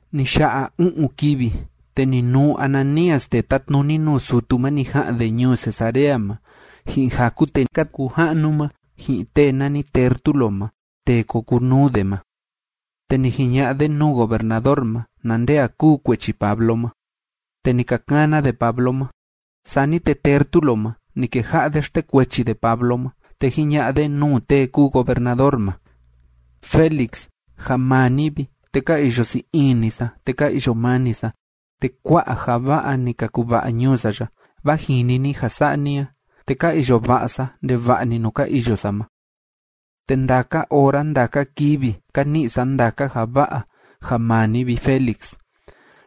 Ni ya'a u'un kivi, te ni nuu Ananías tee tátnuni nuu sutu ma ni ja'an de ñuu Cesarea ma, ji'in jaku tee ka kuu ja'nu ma, ji'in tee nani Tértulo ma tee ko kuu nuu de ma, te ni jiña'a de nuu gobernador ma na nde a kúu kuechi Pablo ma. Te ni ka kana de Pablo ma. Sani te Tértulo ma, ni keja'a de xtekuechi de Pablo ma, te jiña'a de nuu tee kúu gobernador ma: ―Félix, ja maa ni vi, te ka iyo sii ini sa, te ka iyo mani sa, te kua'a ja va'a ni ka kuva'a ñuu sa ya, vaa jini ni ja sa'a ni a, te ka iyo va'a sa ndeva'a‑ni nuu ka iyo sa ma. Te ndaka ora ndaka kivi ka ni'i sa ndaka ja va'a ja maa ni vi, Félix,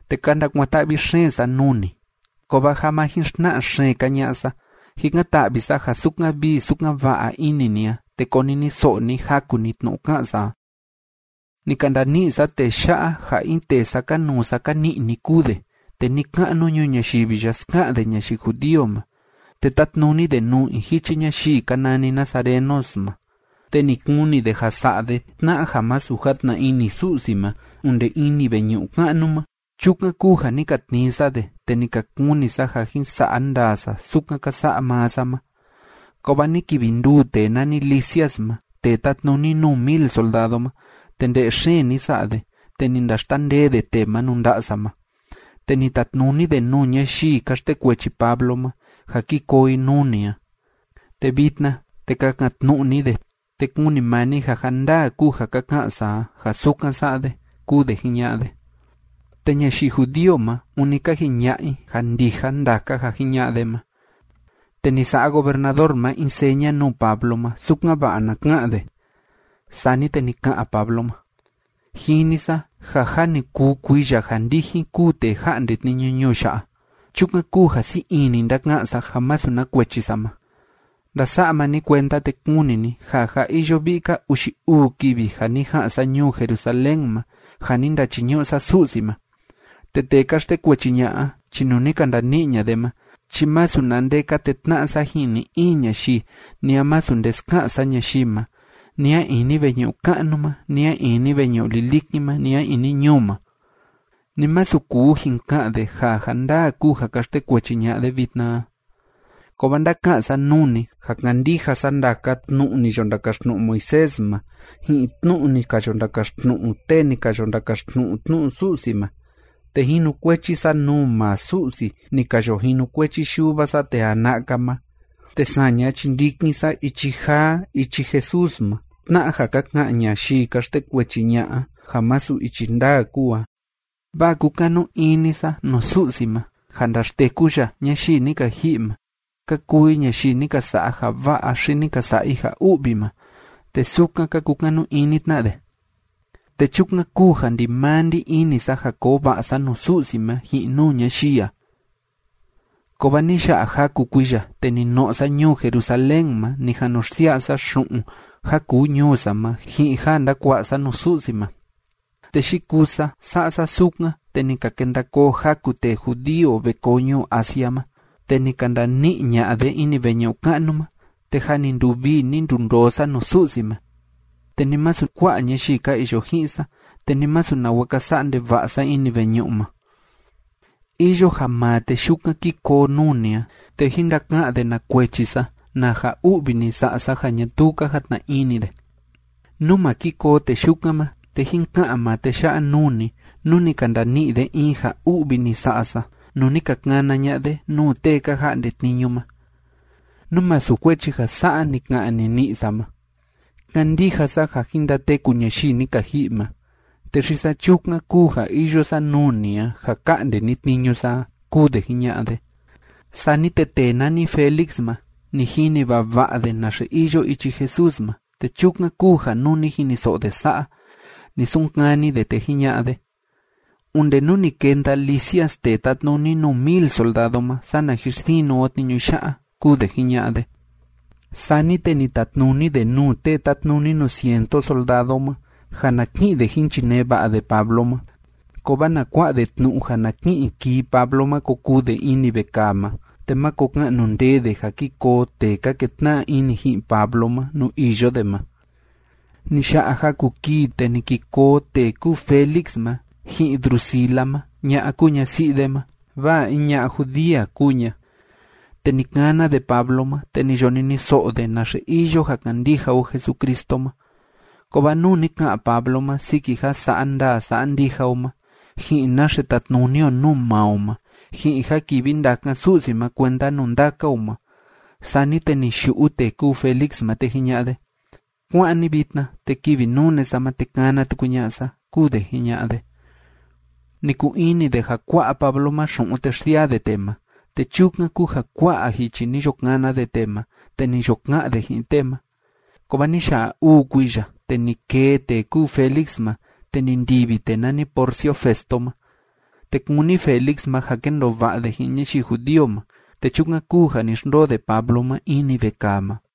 te ka ndakuan‑ta'vi xeen sa nuu ni. Kovaa ja ma jin xtna'a xeen‑ka ña'a sa, jikan‑ta'vi sa ja sukan vii sukan va'a ini ni a, te koniniso'o ni jaku‑ni tnu'u ká'an sa a. Ni ka ndani'i sa tee ya'a ja in tee sákanuu sákani'ni kúu de, te ni‑ka'nu ñuu ñayivi ya ska'an de ñayii judío ma, te tátnuni de nuu in jichi ñayii ka nani nazarenos ma. Te ni kuni de ja sa'a de tna'a ja masu játna ini Su'si ma onde ini veñu'u ka'nu ma. Chukan kúu ja ni ka tnii sa de, te ni ka kuni sa ja jin sa'a ndaa sa sukan ka sa'a maa sa ma, kovaa ni kivi nduu tee nani Lisias ma tee tátnuni nuu mil soldado ma, te nde'e xeen ni sa'a de, te ni ndaxtandee de tee ma nuu nda'a sa ma. Te ni tatnuni de nuu ñayii ka xtekuechi Pablo ma ja ki koo i nuu ni a. Te vitna, te kakan‑tnu'u ni de, te kuni maa ni ja ja ndaa kúu ja ka ká'an sa a, ja sukan sa'a de ―kúu de jiña'a de. Te ñayii judío ma, ûni ka jiña'a i ja ndija ndaka ja jiña'a de ma. Te ni sa'a gobernador ma in seña nuu Pablo ma, sukan‑va'a na ka'an de. Sani te ni ka'an Pablo ma: ―Jini sa ja jâ ni kuu kuiya ja ndijin kúu tee ja'nde tniñu ñuu ya'a. Chukan kúu ja sii ini ndáka'an sa ja masu na kuechi sa ma. Ndasa'a maa ni kuenda, te kuni ni ja jâ iyo vi'i‑ka uxi uu kivi ja ni ja'an sa ñuu Jerusalén ma, ja ni ndachiñu'u sa Su'si ma. Te tee ka xtekuechi ña'a a chi nuu ni ka ndani'i ña'a de ma chi masu na nde ka tetna'a sa ji'in ni‑in ñayii, ni a masu nde ska'an sa ñayii ma, ni a ini veñu'u ka'nu ma, ni a ini veñu'u lilikin ma, ni a ini ñuu ma. Ni masu kuu jin ka'an de ja ja ndaa kúu ja ka xtekuechi ña'a de vitna a. Kovaa ndáka'an sa nuu ni ja kándija sa ndaka tnu'u ni yo ndakaxtnu'u Moisés ma ji'in tnu'u ni ka yo ndakaxtnu'u tee ni ka yo ndakaxtnu'u tnu'u Su'si ma, te jinukuechi sa nuu maa Su'si ni ka yo jinukuechi yuva sa tee jana'a‑ka ma. Te saña chi ndikin sa Ichi Jaa Ichi Jesús ma, tna'a ja ka ka'an ñayii ka xtekuechi ña'a a ja masu ichi ndaa kúu a. Vaa kúkanu ini sa nuu Su'si ma ja ndaxteku ya ñayii ni ka ji'i ma, ka kuu i ñayii ni ka sa'a ja va'a xi ni ka sa'a i ja u'vi ma. Te sukan ka kukanu ini tna de. Te chukan kúu ja ndimaa ndí ini sa ja koo va'a sa nuu Su'si ma ji'in nuu ñayii a. Kovaa ni ya'a jaku kuiya, te ni no'o sa ñuu Jerusalén ma ni jan nu xsia'a sa xu'un ja kuu ñuu sa ma ji'in ja ndakua'a sa nuu Su'si ma. Te yikuu sa sa'a sa sukan, te ni ka kenda koo jaku tee judío ve koo ñuu Asia ma, te ni ka ndani'i ña'a de ini veñu'u ka'nu ma, te jâ ni nduvii ni ndundoo sa nuu Su'si ma, te ni masu kua'a ñayii ka iyo ji'in sa, te ni masu nawa ka sa'a ndeva'a sa ini veñu'u ma. Iyo ja maa tee yukan kí koo nuu ni a, te jín ndaka'an de na kuechi sa, na ja u'vi ni sa'a sa ja ñatuu ka jatna ini de. Nú ma ki koo tee yukan ma, te jín ka'an maa tee ya'a nuu ni, nú ni ka ndani'i de in ja u'vi ni sa'a sa, nuu ni ka kana ña'a de nuu tee ka ja'nde tniñu ma, nú masu kuechi ja sa'a ni ka'an nini'i sa ma: “Kándija sa ja jin ndateku ñayii ni ka ji'i ma, te xi saa chukan kúu ja iyo sa nuu ni a, ja ka'nde ni tniñu sa a” ―kúu de jiña'a de. Sani te tee nani Félix ma, ni jini vava'a de naxe iyo ichi Jesús ma, te chukan kúu ja nuu ni jiniso'o de sa'a, ni sunkani de, te jiña'a de: ―Onde nú ni kenda Lisias tee tátnuni nuu mil soldado ma, sana jin sinu o tniñu ya'a ―kúu de jiña'a de. Sani te ni tatnuni de nuu tee tátnuni nuu cientu soldado ma ja na ki'in de jín chinee va'a de Pablo ma, kovaa na kua'a de tnu'u ja na ki'in kii Pablo ma ko kuu de ini vekaa ma, te máko ka'nu ndee de ja ki koo tee ka ketna'a ini ji'in Pablo ma nuu iyo de ma. Ni ya'a jaku kii, te ni ki koo tee kúu Félix ma, ji'in Drusila ma ña'a kúu ñasi'i de ma, vaa in ña'a judía kúu ña. Te ni kana de Pablo ma, te ni yo niniso'o de naxe iyo ja kandija o Jesucristo ma. Kovaa nuu ni ka'an Pablo ma siki ja sa'a ndaa sa'a ndija o ma, ji'in naxe tatnuni o nuu maa o ma, ji'in ja kivi ndakan Su'si ma kuenda nuu ndaka o ma, sani te ni yu'u tee kúu Félix ma, te jiña'a de: ―Kuá'an ni vitna, te kivi nune sa ma, te kana tuku ña'a sa ―kúu de jiña'a de. Ni kuu ini de ja kua'a Pablo ma xu'un te xsiaa de tee ma, te chukan kúu ja kua'a jichi ni yo kana de tee ma, te ni yo ka'an de ji'in tee ma. Kovaa ni ya'a uu kuiya, te ni kee tee kúu Félix ma, te ni ndivi tee nani Porcio Festo ma. Te kúni Félix ma ja kendoo va'a de ji'in ñayii judío ma, te chukan kúu ja ni xndoo de Pablo ma ini vekaa ma.